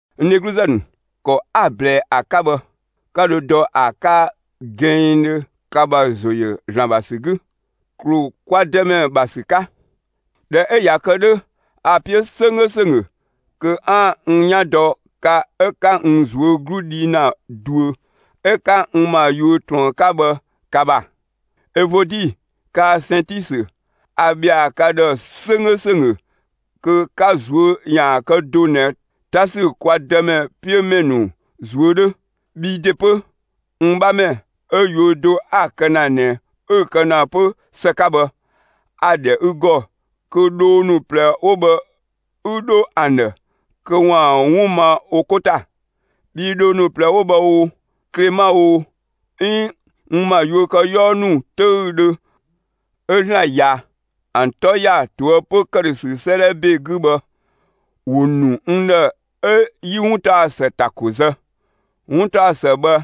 N dheglu ‑nu, ‑kɔ 'a‑ ꞊blɛɛ ‑a 'ka bhë, 'ka dho dɔ ‑a 'ka gɛnngdhö ka ‑bha ‑zo ‑yö ‑Zlan ‑bha ‑sü 'gü, ‑klu kwa Dëmɛ ‑bha ‑sü 'ka. ꞊Dhɛ 'ö ꞊ya kë 'dhö, a‑ 'piö 'sönggö ‑sönggö kö 'aan‑ n 'yan dɔ ka 'ö 'ka n ꞊zuö' 'glu dhi ‑na ꞊duö 'ö 'ka n ‑ma yuö ꞊truën 'ka bhë ka ‑bha. Evodi kaa‑ Sɛntisö, a ‑bhɛa ka ‑dhë 'sönggö ‑sönggö kö ka ꞊zuö' ‑yaan kë do ꞊nɛ 'ta ‑sü kwa Dëmɛ 'piö ‑mɛ ‑nu ꞊zuö' 'dhö. Bhi ‑de 'pö, n 'bhamɛ 'ö yuö do 'a‑ kë ‑na ꞊nɛ 'ü‑ kë ‑na 'pö ‑së 'ka bhë, a‑ ‑dhɛ ü ‑gɔ kö dhoo ‑nu ꞊plɛ 'wo bhë 'ü 'dho ‑an ‑dhë kö ‑waan 'wun ma wo 'ko ‑ta. Bhii dhoo ‑nu ꞊plɛ 'wo bhë oo, Klema oo, 'iin n ‑ma yuökëyɔɔ ‑nu 'töüdhö 'ö ‑Zlan ꞊ya ‑an 'tɔ ‑ya ꞊toëpö ‑këdhösü 'sëëdhɛ ‑be 'gü bhë, ‑wo ‑nu n ‑dhë 'ö 'yi 'wuntaɔsë ‑ta ‑ko zë, 'wuntaɔsë bhë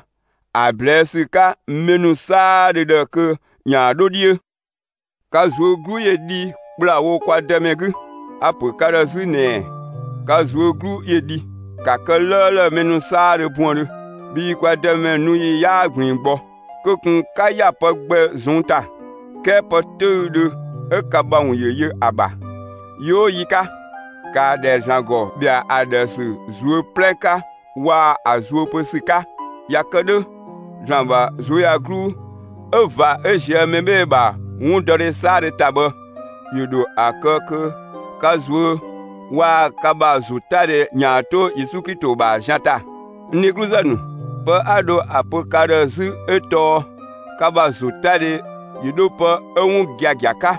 ‑a ꞊blɛɛ' ‑sü 'ka mɛ ‑nu 'saadhö ‑dhë kö ‑yaan 'dho 'dhiö. Ka ꞊zuö' 'glu ‑yö dhi ‑kplawo kwa Dëmɛ 'gü! A‑ ‑pö ka ‑dhë 'zü ꞊nɛɛ: Ka ꞊zuö' 'glu ‑yö dhi! ‑Ka kë 'lëëlë mɛ 'saadhö buëndhö, bhii kwa Dëmɛ nu ‑yi 'yaa ꞊gbiin gbɔ! Kö ꞊kun 'ka ‑ya pë gbɛ ꞊zɔnng' ‑ta, 'kɛɛ pë 'töüdhö 'ö ka ‑bha ‑wun ‑yö yö ‑a ‑bha yi 'oo yi 'ka, ‑kaa ‑dhɛ ‑Zlan ‑gɔ ‑bhɛa ‑a ‑dhë ‑sü ꞊zuö' 'plɛ 'ka waa‑ ‑a zuö pö ‑sü 'ka! ꞊Ya kë 'dhö, ‑Zlan ‑bha ꞊zuöyagluu 'ö ꞊va 'ö ꞊zië' mɛ 'bhee‑ ‑bha 'wundɔdhe 'saadhö ‑ta bhë, ‑yö ‑dho ‑a kë kö ka ꞊zuö' waa‑ ka ‑bha ‑zotadhe ‑yaan 'to Yesu Klito ‑bha zian ‑ta. N dhegluzë ‑nu, pë 'a dho ‑a pö ka ‑dhë 'zü 'ö tɔɔ: Ka ‑bha ‑zotadhe ‑yö 'dho pë 'ö 'wun gia‑ 'ka,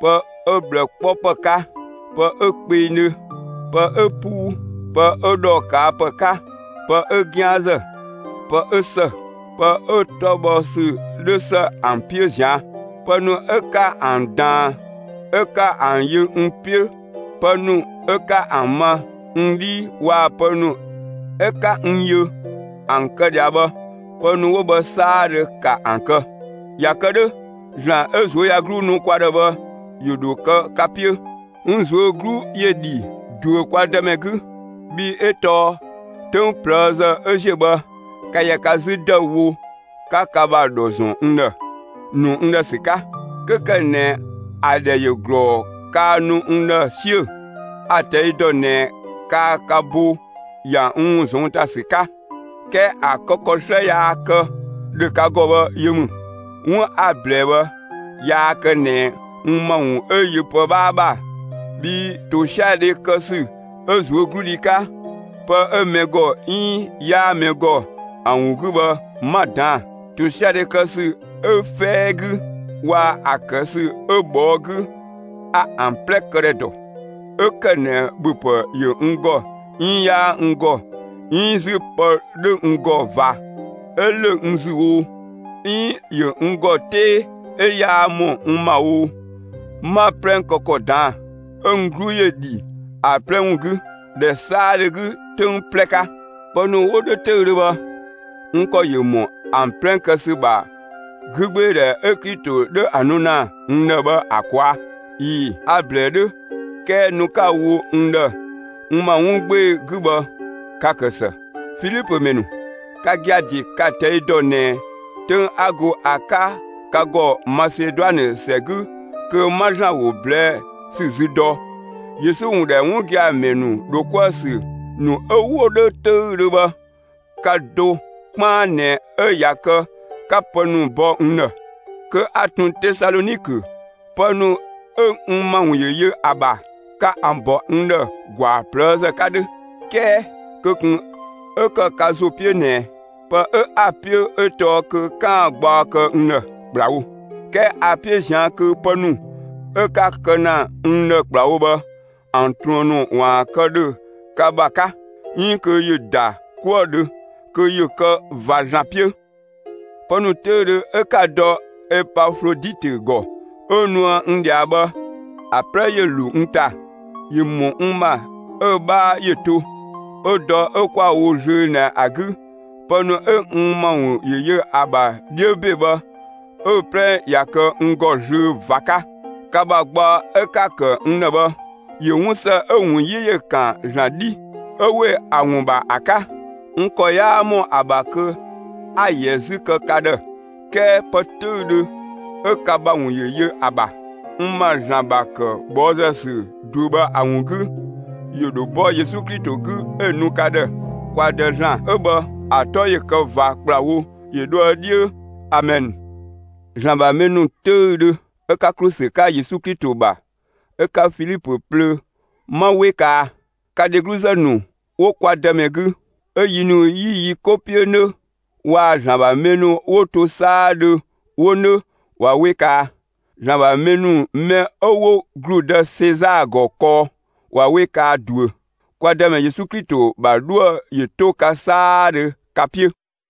pë 'ö ꞊bhlë 'kpɔ ‑pë 'ka, pë 'ö kpengdhö, pë 'ö 'puu, pë 'ö ‑dhɔ ꞊kaa' ‑pë 'ka, pë 'ö 'gianzë, pë 'ö ‑së, pë 'ö‑ 'tɔ bhɔ ‑sü 'dhö ‑së ‑an 'piö ꞊zian'. Pë ‑nu 'ö 'ka ‑an ꞊daan 'ö 'ka ‑an yö n 'piö, pë ‑nu 'ö 'ka ‑an ma n 'dhii waa‑ pë ‑nu 'ö 'ka n yö ‑an kë ꞊dhia bhë, pë ‑nu 'wo bhë 'saadhö, ‑ka ‑an kë! ꞊Ya kë 'dhö ‑Zlan 'ö ꞊zuöyagluu nu kwa ‑dhë bhë ‑yö ‑dho kë ka 'piö. N ꞊zuö' 'glu ‑yö ‑dhi ꞊duö kwa Dëmɛ 'gü, bhii 'ö tɔɔ 'töng ꞊plëëzë 'ö ‑ziö bhë, ka ‑yɛ 'zü ‑dëüwo, 'ka ka ‑bha ‑dhɔ ‑zɔn n ‑dhë, ‑nu n ‑dhë ‑sü 'ka. 'Kö ‑kë ꞊nɛ ‑a ‑dhɛ ‑yö ꞊glɔɔ kaa nu n ‑dhë 'siö‑, a‑ ꞊tɛi' dɔ ꞊nɛ kaa ka bo ‑ya n ‑wun ꞊zɔnng' ‑ta ‑sü 'ka, 'kɛɛ ‑a kë ‑kɔ 'slë yaa kë ‑dhö ka ‑gɔ bhë yö ‑mü. 'Wun 'a‑ ꞊blɛɛ bhë, yaa kë ꞊nɛ n ‑ma ‑wun 'ö yö pë 'bhaa ‑bha, bhii ‑tosiadhe kë ‑sü 'ö ꞊zuögludhi 'ka, pë 'ö mɛ ‑gɔ 'iin 'yaa mɛ ‑gɔ ‑a ‑wun 'gü bhë, 'ma‑ ꞊daan'‑. ‑Tosiadhe kë ‑sü 'ö 'fɛɛ 'gü waa‑ ‑a kë ‑sü 'ö ꞊bhɔɔ' 'gü, a ‑an 'plɛ këdhɛ ‑dɔ. 'Ö ‑kë ꞊nɛ ‑bhöpë ‑yö n ‑gɔ 'iin 'yaa n ‑gɔ, 'iin 'zü pë 'dhö n ‑gɔ ꞊va 'ö ‑lö n ‑zü oo, 'iin ‑yö n ‑gɔ 'tee 'ö yaa ‑mɔ n ‑ma oo, 'ma‑ 'plɛ kë ‑kɔ ꞊daan'‑; 'ö n 'glu ‑yö ‑dhi ‑a 'plɛ ‑wun 'gü, ‑dhɛ 'saadhö 'gü 'töng 'plɛ 'ka. Pë ‑nu 'wo 'dhö 'töüdhö bhë, n ‑kɔ ‑yö ‑mɔ ‑an 'plɛ kë ‑sü ‑bha 'gügbeedhɛ 'ö Klito 'dhö ‑a nu ‑na n ‑dhë bhë ‑a ꞊kwaa'. ꞊Ii‑, a‑ ꞊blɛɛ 'dhö 'kɛɛ nu 'ka‑ wo n ‑dhë n ‑ma 'wun 'gbee‑ 'gü bhë, ka‑ ‑kë ‑së. Filipö ‑mɛ ‑nu, ka gia‑ ‑de ka‑ ꞊tɛi' dɔ ꞊nɛ 'töng 'a go ‑a 'ka ka ‑gɔ Maseduanë ‑sɛ 'gü kö 'ma ‑Zlan ‑wo ꞊blɛɛ' ‑sü zü dɔ, Yesu ‑wun ‑dhɛ 'wun gia‑ ‑mɛ ‑nu ‑dho 'kuë‑ ‑sü ‑nu 'ö 'wo ‑dhö 'töüdhö bhë, ka do 'kpaan ꞊nɛ 'ö ꞊ya kë 'ka pë ‑nu bɔ n ‑dhë. Kö 'a ꞊tun Tesalɔnikö, pë ‑nu 'ö n ‑ma ‑wun ‑yö yö ‑a ‑bha, ka ‑an ‑bɔ n ‑dhë ‑gwaa ꞊plëëzë 'ka 'dhö. 'Kɛɛ, kö ꞊kun 'ö ‑kë ka ‑zo 'piö ꞊nɛ pë 'ö 'a‑ 'piö 'ö tɔɔ kö 'kaan‑ gbaɔ kë n ‑dhë ‑kplawo. 'Kɛɛ 'a‑ 'piö ꞊zian' kö pë ‑nu 'ö 'ka‑ kë ‑na n ‑dhë ‑kplawo bhë, ‑an ꞊truën ‑nu ‑waan kë ‑dhö ka ‑bha 'ka, 'iin kö ‑yö ‑da 'kuë‑ dhö, kö ‑yö kë ꞊va ‑Zlan 'piö. Pë ‑nu 'töüdhö 'ö 'ka‑ dɔ Epafloditö ‑gɔ 'ö nuë n ꞊dhia bhë, ‑a 'plɛ ‑yö ‑lo n ‑ta. ‑Yö ‑mɔ n ‑ma 'ö‑ 'bhaa ‑yö to. 'Ö dɔ 'ö 'kwa‑ wo zlöö ꞊nɛ ‑a 'gü, pë ‑nu 'ö n ‑ma ‑wun ‑yö yö ‑a ‑bha 'dhiö ‑be bhë, 'ö‑ 'plɛ ꞊ya kë n ‑gɔ zlöö ꞊va 'ka. Ka ‑bha gbaɔ 'ö 'ka‑ ‑kë n ‑dhë bhë, ‑yö 'wun ‑së 'ö‑ ‑wun 'yi ‑yö ‑kan ‑Zlan 'dhi, 'ö ‑we ‑a ‑wun ‑bha ‑a 'ka; (n ‑kɔ 'yaa ‑mɔ ‑a ‑bha kö 'a‑ ‑yɛ 'zü kë ka ‑dhë; 'kɛɛ) pë 'töüdhö 'ö ka ‑bha ‑wun ‑yö yö ‑a ‑bha, n ma ‑Zlan ‑bha ‑kë ꞊bhɔɔzë ‑sü ꞊duö bhë ‑a ‑wun 'gü, ‑yö ‑dho bɔ Yesu Klito 'gü 'ö‑ nu ka ‑dhë. Kwa Dë ‑Zlan 'ö bhë ‑a 'tɔ ‑yö kë ꞊va ‑kplawo ‑yö dhoë 'dhiö. Amɛn. ‑Zlan ‑bha mɛ ‑nu 'töüdhö, 'ö 'ka ‑klu ‑sü 'ka Yesu Klito ‑bha 'ö 'ka Filipö plöö, 'ma 'we kaa! Ka dhegluzë ‑nu 'wo kwa Dëmɛ 'gü 'ö yi ‑nu 'yi yi 'ko 'piö 'nö waa‑ ‑Zlan ‑bha mɛ ‑nu 'wo to 'saadhö 'wo 'nö, ꞊wa 'we kaa! ‑Zlan ‑bha mɛ ‑nu mɛ 'ö 'wo ‑gludë Sezaa ‑gɔ kɔɔ, ꞊wa 'we kaa ꞊duö. Kwa Dëmɛ Yesu Klito ‑bha 'dhuë‑ ‑yö 'to ka 'saadhö ka 'piö!